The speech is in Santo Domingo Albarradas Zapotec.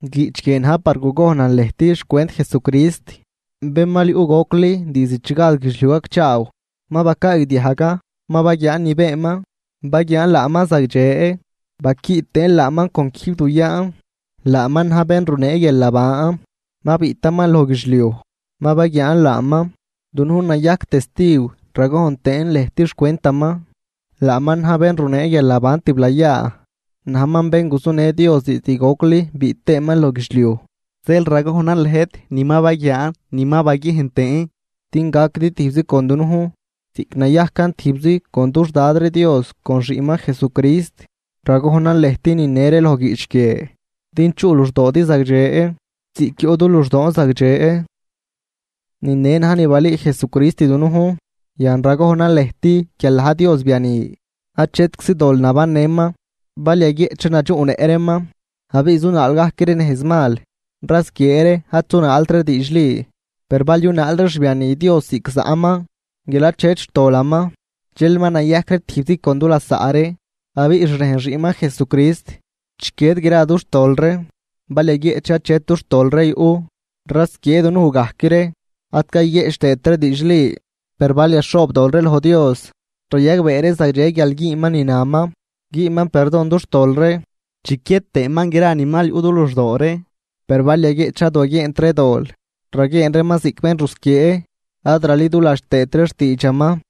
Guiꞌch guie na̱j par gugojnan lëjt xcwent Jesucrist, bén mal yuꞌ gocli diizd chi gad guidxliuj gacchaaw. Ma bacaagdiajgan, ma baguiaan ni beenman, baguiaan laaman zagdxe, ma baquiꞌ tëën laaman con quijb du yaan. Laaman na̱j bén runee guialnaban, ma biꞌtaman loj guidxliuj, ma baguiaan laaman, dunujn nayajc testiw ragojn tëën lëjt xcwentaman. Laaman na̱j bén runee guialnaban tiblayaa, najman bén guzunë Dios diizd gocli biꞌt tëëman loj guidxliuj. Zeel ragojnan lëjt ni ma baguiaan ni ma baguiejn tëën din gaquidi tijbzi con dunujn ziꞌc nayajcan tijbzi con dux Dad ree Dios con xiꞌnman Jesucrist. Ragojnan lëjt nine ree loj guiꞌch guie din chuꞌ luxdoodi zagdxe, ziꞌc yuꞌ du luxdoon zagdxe. Ni ne na̱j ni balüü Jesucrist dunujn, yan ragojnan lëjt guial na̱j Dios biani, achetczi dol nabannëman. Bal yaguieꞌch ree nadxuꞌnëꞌ reeman abiꞌ zunaal gajc ree nejz mal rasquiee ree ad zunaalt ree diidxli. Per bal yunaal ree xbiani Dios ziꞌc zaꞌman, guial achet xtolaman, dxel ma nayajc ree tijbzi con du lasaꞌ ree. Abiꞌ xrejn xiꞌnman Jesucrist chiquied gra dux tol ree. Bal yaguieꞌch ree achet dux tol ree yuꞌ, rasquiee dunuj gajc ree, ad cayguieꞌch tëët ree diidxli. Per bal yaxhoobdol ree loj Dios, rayagbee ree zagdxe guial güünman ni naman, güünman perdon dux tol ree, chiquied tëëman gra ni mal yuꞌ du luxdoo ree. Per bal yaguieꞌch ree ad waguieent ree dol, raguieen reeman ziꞌc bénrusquiee, ad raliduladx tëët ree xtiidxaman.